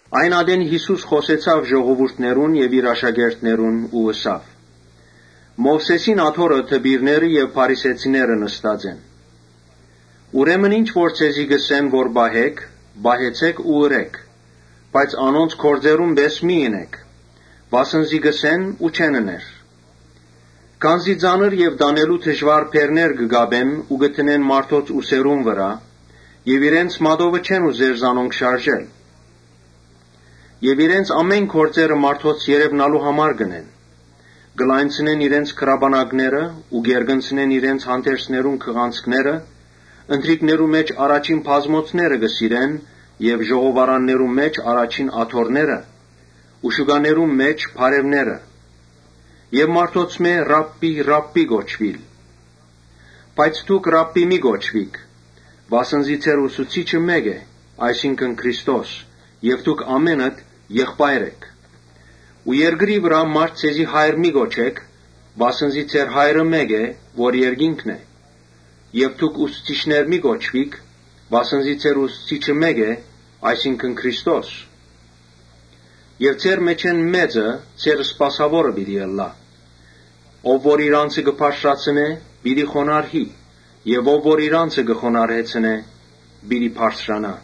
Այն ատեն Յիսուս խօսեցաւ ժողովուրդներուն եւ իր աշակերտներուն ու ըսաւ. «Մովսէսին աթոռը դպիրները եւ փարիսեցիները նստած են։ Ուրեմն ինչ որ ձեզի ըսեն որ պահէք, պահեցէք ու ըրէք, բայց անոնց գործերուն պէս մի՛ ընէք, վասն զի կ’ըսեն ու չեն ըներ։ Քանզի ծանր ու տանելու դժուար բեռներ կը կապեն ու կը դնեն մարդոց ուսերուն վրայ եւ իրենց մատովը չեն ուզեր զանոնք շարժել։ Իրենց բոլոր գործերը մարդոց երեւնալու համար կ’ընեն. կը լայնցնեն իրենց գրապանակները ու կ’երկնցնեն իրենց հանդերձներուն քղանցքները. Ընթրիքներու մէջ առաջին բազմոցները կը սիրեն եւ ժողովարաններուն մէջ առաջին աթոռները ու շուկաներուն մէջ բարեւները։ Եւ մարդոցմէ Ռաբբի, Ռաբբի կոչուիլ։ Բայց դուք Ռաբբի մի՛ կոչուիք, վասն զի ձեր Ուսուցիչը մէկ է, այսինքն Քրիստոս։ Դուք ամէնքդ եղբայր էք։ Ու երկրի վրայ մա՛րդ ձեզի Հայր մի կոչէք, վասն զի ձեր Հայրը մէկ է, որ երկինքն է։ Եւ դուք ուսուցիչներ մի՛ կոչուիք, վասն զի ձեր Ուսուցիչը մէկ է, այսինքն Քրիստոս։ Եւ ձեր մէջէն մեծը ձեր սպասաւորը թող ըլլայ։ Ով որ իր անձը բարձրացնէ, պիտի խոնարհի եւ ով որ իր անձը խոնարհեցնէ, պիտի բարձրանայ»։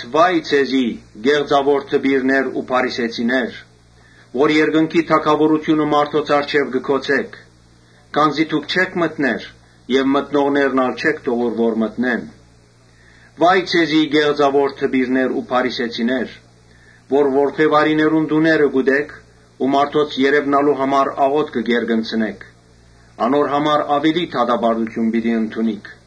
«Վա՜յ ձեզի, կեղծաւոր դպիրներ ու փարիսեցիներ, որ երկնքի թագաւորութիւնը մարդոց առջեւ կը գոցէք ու դուք չէք մտներ եւ մտնողներն ալ չէք թողուր որ մտնեն։ Վա՜յ ձեզի, կեղծաւո՛ր դպիրներ ու փարիսեցիներ որ որբեւարիներուն տուները կ’ուտէք ու մարդոց երեւնալու համար աղօթքը կ’երկնցնէք. անոր համար աւելի դատապարտութիւն պիտի ընդունիք։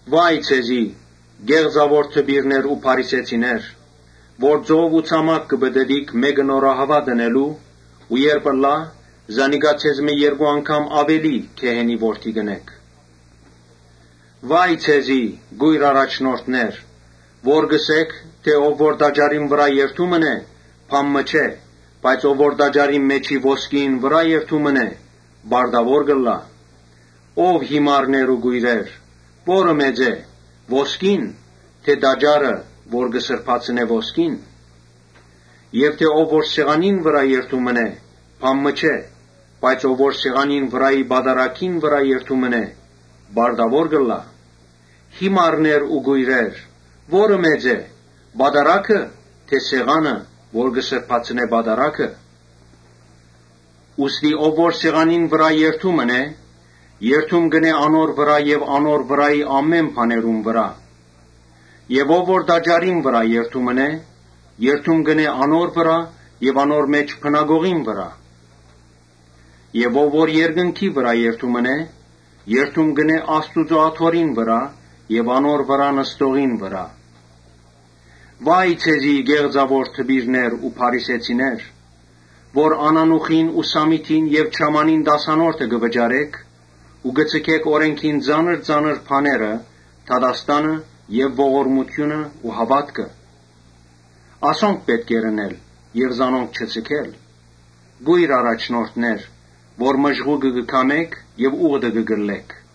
Վա՜յ ձեզի, կեղծաւո՛ր դպիրներ ու փարիսեցիներ, որ ծով ու ցամաք կը պտըտիք մէկը նորահաւատ ընելու ու երբ ըլլայ, զանիկա ձեզմէ երկու անգամ աւելի գեհենի որդի կ’ընէք։ Վա՜յ ձեզի կո՛յր առաջնորդներ, որ կ’ըսէք թէ ‘Ով որ տաճարին վրայ երդում ընէ, բան մը չէ, բայց ով որ տաճարին մէջի ոսկիին վրայ երդում ընէ, պարտաւոր կ’ըլլայ’։ Ո՛վ յիմարներ ու կոյրեր, ո՞րը մեծ է, ոսկի՞ն թէ տաճարը որ կը սրբացնէ ոսկին։ Եւ թէ ‘Ով որ սեղանին վրայ երդում ընէ, բան մը չէ, բայց ով որ սեղանին վրայի պատարագին վրայ երդում ընէ, պարտաւոր կ’ըլլայ’։ Յիմարնե՛ր ու կոյրեր, ո՞րը մեծ է, պատարա՞գը թէ սեղանը որ կը սրբացնէ պատարագը։ Ուստի ով որ սեղանին վրայ երդում ընէ, երդում կ’ընէ անոր վրայ եւ անոր վրայի ամէն բաներուն վրայ Եւ ով որ տաճարին վրայ երդում ընէ, երդում կ’ընէ անոր վրայ եւ անոր մէջ բնակողին վրայ Եւ ով որ երկնքի վրայ երդում ընէ, երդում կ’ընէ Աստուծոյ աթոռին վրայ եւ անոր վրայ նստողին վրայ։ Վա՜յ ձեզի, կեղծաւո՛ր դպիրներ ու փարիսեցիներ, որ անանուխին ու սամիթին եւ չամանին տասանորդը կը վճարէք ու կը ձգէք օրէնքին ծանր ծանր բաները, դատաստանը եւ ողորմութիւնը ու հաւատքը. ասոնք պէտք է ընէիք եւ զանոնք չձգէիք։ Կո՛յր առաջնորդներ, որ մժղուկը կը քամէք եւ ո՛ւղտը կը կլլէք։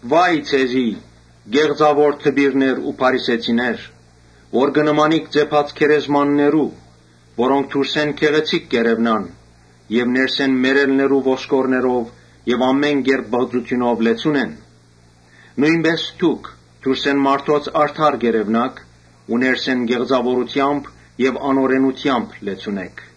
Վա՜յ ձեզի, կեղծաւո՛ր դպիրներ ու փարիսեցիներ, որ կը նմանիք ծեփած գերեզմաններու, որոնք դուրսէն գեղեցիկ կ’երեւնան, բայց ներսէն մեռելներու ոսկորներով եւ ամէն կերպ պղծութիւնով լեցուն են։ Նոյնպէս դուք դուրսէն մարդոց արդար կ’երեւնաք ու ներսէն կեղծաւորութեամբ եւ անօրէնութեամբ լեցուն էք։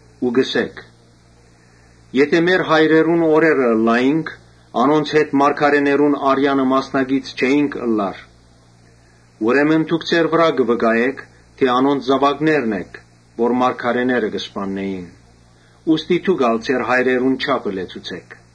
Ու կ’ըսէք. ‘Եթէ մեր հայրերուն օրերը ըլլայինք, անոնց հետ մարգարէներուն արեանը մասնակից չէինք ըլլար’։ Ուրեմն դուք ձեզի համար կը վկայէք թէ անոնց զաւակներն էք՝ որոնք մարգարէները կը սպաննէին։ Ուստի դուք ալ ձեր հայրերուն չափը լեցուցէք։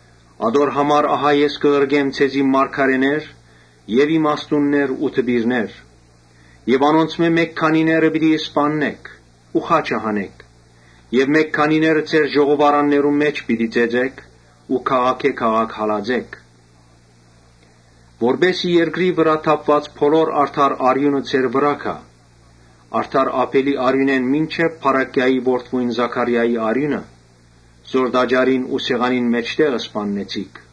Ատոր համար ահա ես կը ղրկեմ ձեզի մարգարէներ եւ իմաստուններ ու դպիրներ։ Անոնցմէ մէկ քանիները պիտի սպաննէք ու խաչը հանէք, մէկ քանիները ձեր ժողովարաններուն մէջ պիտի ծեծէք ու քաղաքէ քաղաք հալածէք։ Որպէս զի երկրի վրայ թափուած բոլոր արդար արիւնը ձեր վրայ գայ, արդար Աբէլի արիւնէն մինչեւ Բարաքիայի որդիին Զաքարիային արիւնը, որ տաճարին եւ սեղանին միջեւ սպաննեցիք։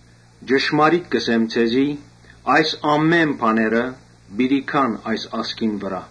Ճշմարիտ կ’ըսեմ ձեզի, այս ամէն բաները պիտի գան այս ազգին վրայ»։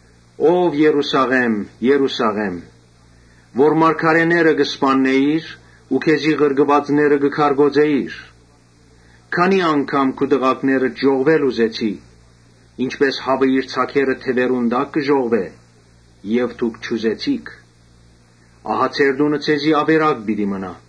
«Ո՛վ Երուսաղէմ, Երուսաղէմ, որ մարգարէները կը սպաննէիր ու քեզի ղրկուածները կը քարկոծէիր, քանի՜ անգամ քու տղաքներդ ժողվել ուզեցի, ինչպէս հաւը իր ձագերը թեւերուն տակ կը ժողվէ եւ դուք չուզեցիք։ Ահա ձեր տունը ձեզի աւերակ պիտի մնայ։